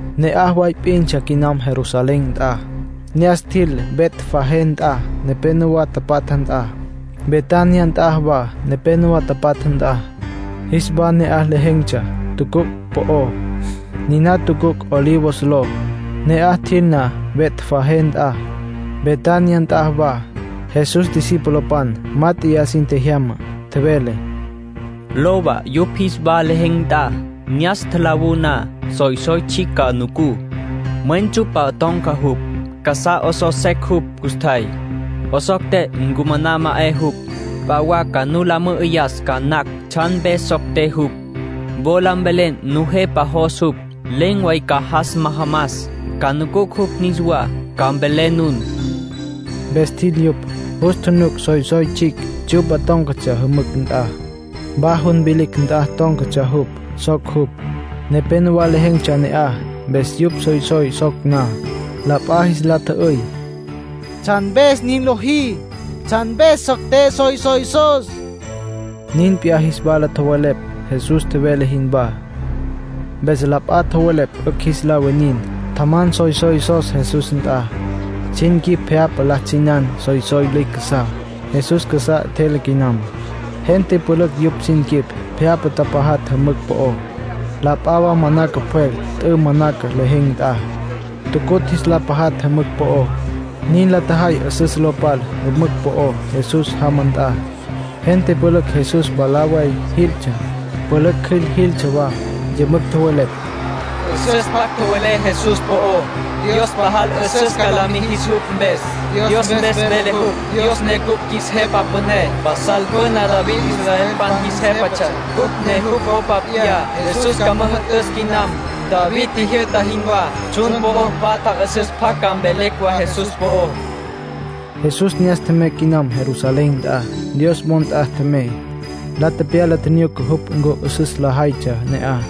Ne'aj way p'intsja quinam Jerusalén nt'a. Ne'as tjil Betfagé nt'a nepénowa tapatja nt'a, Betania nt'a wa nepénowa tapatja nt'a. Jis wa ne'aj lejen̈tsja tucuc' po'ó, niná tucuc' Olivos ló. Ne'aj tjil na Betfagé nt'a, Betania nt'a wa, Jesús discipulopan mát'eya sin tjejyama, tjevele: “Lowa yupj jis wa lejen̈ nt'a. Ne'as tjalawú na soysoy tsjicj ca nucú. Mwen tsyu'pa ton̈ca jupj. Casá 'osos secj jupj custjay. 'Osocté, ncumaná ma 'e jupj. P'a wa ca nu la mü'üyas ca nacj tsjan mpes socté jupj. Wola mvelé Nujepa jos jupj. Len̈ way ca jas majamas, ca ncunucj jupj niswá, ca mvelé nun.” Mpes tjil yupj. Jus tjunuc soysoy tsjicj, tsyu'pa tón̈catsja jümücj nt'a. Wa jun vilicj nt'a tón̈catsja jupj. Soc jupj. Nepénowa lejen̈tsja ne'aj, mpes yupj soysoy soc na, la p'a jis la tjü'üy: “¿Tsjan mpes nin lojí? ¿Tsjan mpes socté soysoysos?” Nin p'iyá jis wala tjowelepj Jesús tjevele jinwá. Mpes la p'a tjowelepj 'ücj jis la winin. Tjaman soysoysos Jesús nt'a. Sin quip pje'apa la tsjinan soysoy lüicj casá. Jesús casá 'etjele quinam. Gente pülücj yupj sin quip pje'apa tapajatj jümücj po'ó. La p'a wa manaca pjwel t'ü manaca lejen̈ nt'a. Tucutj, jis tapajatj jümücj po'ó. Nin la tjajay 'üsüs lo pal jümücj po'ó Jesús jama nt'a. Gente pülücj Jesús mwalá way jiltsja. Pülücj cjüil jiltsja wa. Yümücj tjowelepj: “'Üsüs pjac tjowelé Jesús po'ó. Dios pajal 'üsüs ca la mijis jupj mpes. Dios mpes vele jupj, Dios ne cupj qjuis Jepa Püné. Pasal püna David israelpan jis jépatsja, cupj ne jupj popa p'iyá. Jesús ca müjü'tüs quinam, David tjijyü'ta jinwá. Tsjun po'o patja 'üsüs pjac ca mvelecj wa Jesús po'ó.” Nin tjowelepj. Jesús ne'as tjemey quinam Jerusalén nt'a. Dios wo nt'a tjemey. La tepyala tjinyuca jupj ncu 'üsüs lajaytsja ne'aj.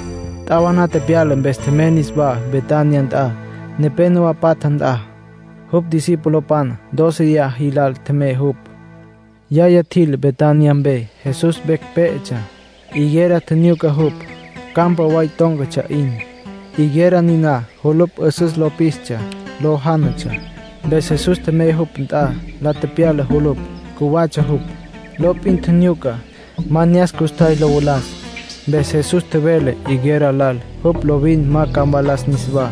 T'awaná tepyala mpes tjemey niswá Betania nt'a, nepénowa patja nt'a. Jupj discipulopan dóceya jilal tjemey jupj. Yaya tjil Betania mpe. Jesús vecj pé'etsja. Higuera tjinyuca jupj, campa way tón̈catsja 'in. Higuera niná julupj 'üsüs lo pistsja. Lo jánatsja. Mpes Jesús tjemey jupj nt'a. La tepyala julupj. Cjuwatsja jupj. Lo p'in tjinyuca. Ma ne'as custjay lo valas. Mpes Jesús tjevele higuera lal jupj lovin ma ca mvalas niswá.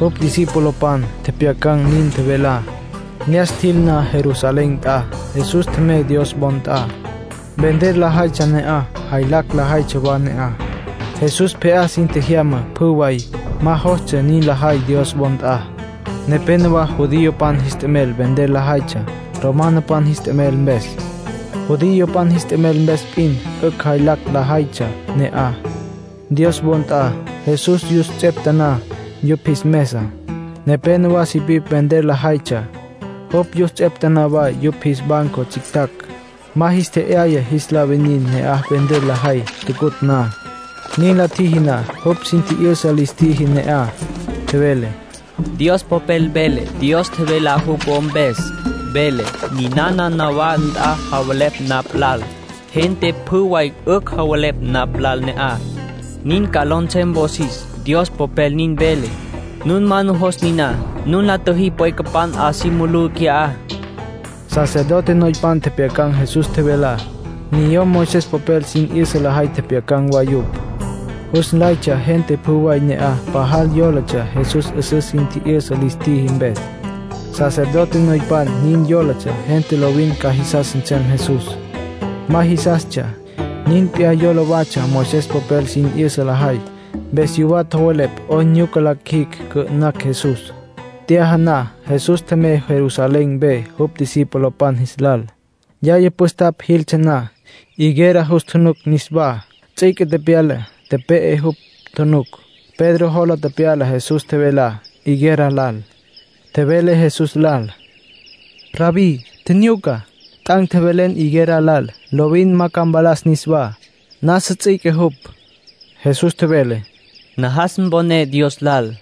Jupj discipulopan tjepjyacan̈ nin tjevelá. Ne'as tjil na Jerusalén nt'a, Jesús tjemey Dios wo nt'a. Vender lajaytsja ne'aj, jaylacj lajaytsja wa ne'aj. Jesús pje'á sin tjejyama pjü way. Ma jostsja nin lajay Dios wo nt'a. Nepénowa judiopan jis t'emel vender lajaytsja romanopan jis t'emel mpes. Judiopan jis t'emel mpes p'in 'ücj jaylacj lajaytsja ne'aj, Dios wo nt'a. Jesús yus ts'eptaná yupj jis mesa. Nepénowa sipipj vender lajaytsja. Jupj yus ts'eptaná wa yupj jis banco tsjictjacj. Ma jis tje'yaya jis la winin ne'aj vender lajay tucutj na. Nin la tjiji na, jupj sin tji'yüsa lis tjiji ne'aj. Tjevele: “Dios Popel vele Dios tjevelá jupj wo mpes. Vele: ‘Ninana nawá nt'a javelepj napj lal. Gente pjü way 'ücj javelepj napj lal ne'aj. Nin ca ló nsem wosis’, Dios Popel nin vele. Nun ma nujos niná. Nun la tjüjí pwecapan 'a si mulú qui'á.” Sacerdote noypan tjepjyacan̈ Jesús tjevelá, niyom Moisés popel sin 'yüsa lajay tjepjyacan̈ wa yupj. Jus nlaytsja gente pjü way ne'aj pajal yólatsja Jesús 'üsüs sin tji'yüsa lis tjiji mpes. Sacerdote noypan nin yólatsja gente lovin ca jisas nsem Jesús. Ma jisastsja. Nin p'iyá yola watsja Moisés popel sin 'yüsa lajay. Mpes yuwá tjowelepj 'oyn la qjuijicj cü'ü'nacj Jesús. T'yaja na Jesús tjemey Jerusalén mpe jupj discipulopan jis lal. Yaya püstapj jiltsja na, higuera jus tjunuc niswá. Ts'üique tepyala, tepe'e jupj, tjunuc. Pedro jola tepyala Jesús tjevelá higuera lal. Tjevele Jesús lal: —Rabbí, tjinyuca. T'an̈ tjevelen higuera lal lovin ma ca mvalas niswá. Nasa ts'üique jupj. Jesús tjevele: —Najas mponé Dios lal.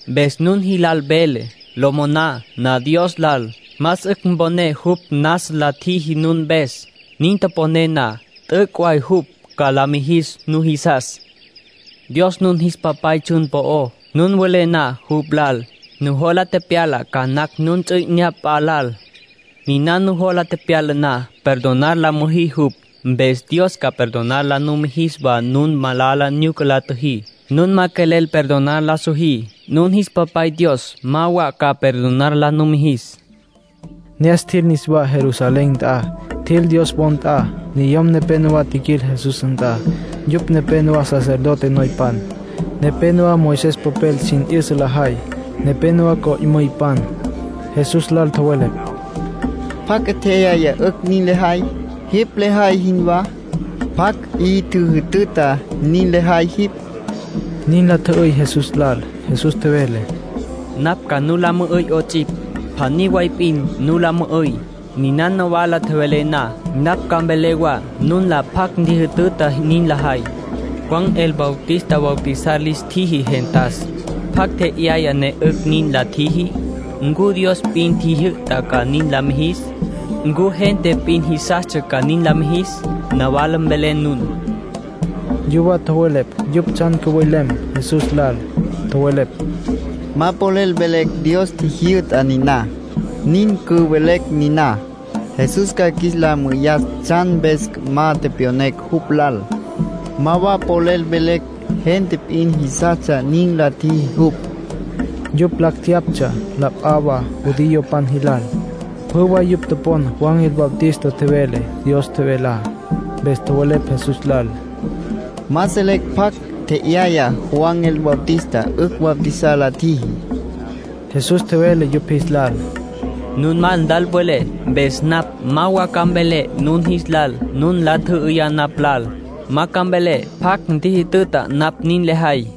Mpes nun jilal velé, lo moná na Dios lal, más 'ücj mponé jupj nasa nin la tjiji nun mpes. Nin toponé na, t'üc' way jupj ca la mijis nujisas. ”Dios nun jis Papay tsjun po'ó. Nun welé na jupj lal, nujola pyala ca nacj nun ts'u 'inyá p'a lal. Niná nujola tepyala na, perdonar la müjí jupj. Mpes Dios ca perdonar la numijis wa nun malala nyuca la tjüjí. Nun ma quelel perdonar la sojí, nun jis Papay Dios ma wa ca perdonar la numijis. Ne'as tjil niswá Jerusalén nt'a. Tjil Dios wo nt'a. Niyom nepénowa tjiquil Jesús nt'a, yupj nepénowa sacerdote noypan, nepénowa Moisés popel sin 'yüsa lajay, nepénowa co'müypan. Jesús lal tjowelepj: —¿Pjacj 'e tje'yaya 'ücj nin lejay, jipj lejay jinwá? ¿Pjacj 'i tjüjütüta nin lejay jipj? —nin la tjü'üy Jesús lal. Jesús tjevele: —Napj ca nu la mü'üy 'ots'ipj. Pjaní way p'in nu la mü'üy. Niná nawala tjowelé na, napj ca mvelé wa nun lal pjacj ntjijütüta nin lejay. Juan el Bautista bautizar lis tjiji gentas. ¿Pjacj tje'yaya ne 'ücj nin la tjiji? ¿Ncu Dios p'in tjijyü'ta ca nin la mijis? ¿Ncu gente p'in jisastsja ca nin la mijis? Nawala mvelé nun. Yuwá tjowelepj yupj tsjan cüwelem Jesús lal. Tjowelepj: “Ma polel mvelecj Dios tjijyü'ta niná. Nin cüvelecj niná, Jesús ca qjuis la mü'üyas tsjan mpes ma tepyonecj jupj lal. Ma wa polel velecj gente p'in jisastsja nin la tjiji jupj.” (Yupj lacj jeyaptsja la p'a wa judiopan jilal. Pjü way yupj topon Juan el Bautista tjevele Dios tjevelá.) Mpes tjowelepj Jesús lal: —Ma selecj pjacj tje'yaya Juan el Bautista 'ücj bautizar la tjiji. Jesús tjevele yupj jis lal: —Nun ma nlal tjowelé, mpes napj ma wa ca mvelé nun jis lal nun nla tjü'üyá napj lal. Ma ca mvelé pjacj ntjijütüta napj nin lejay.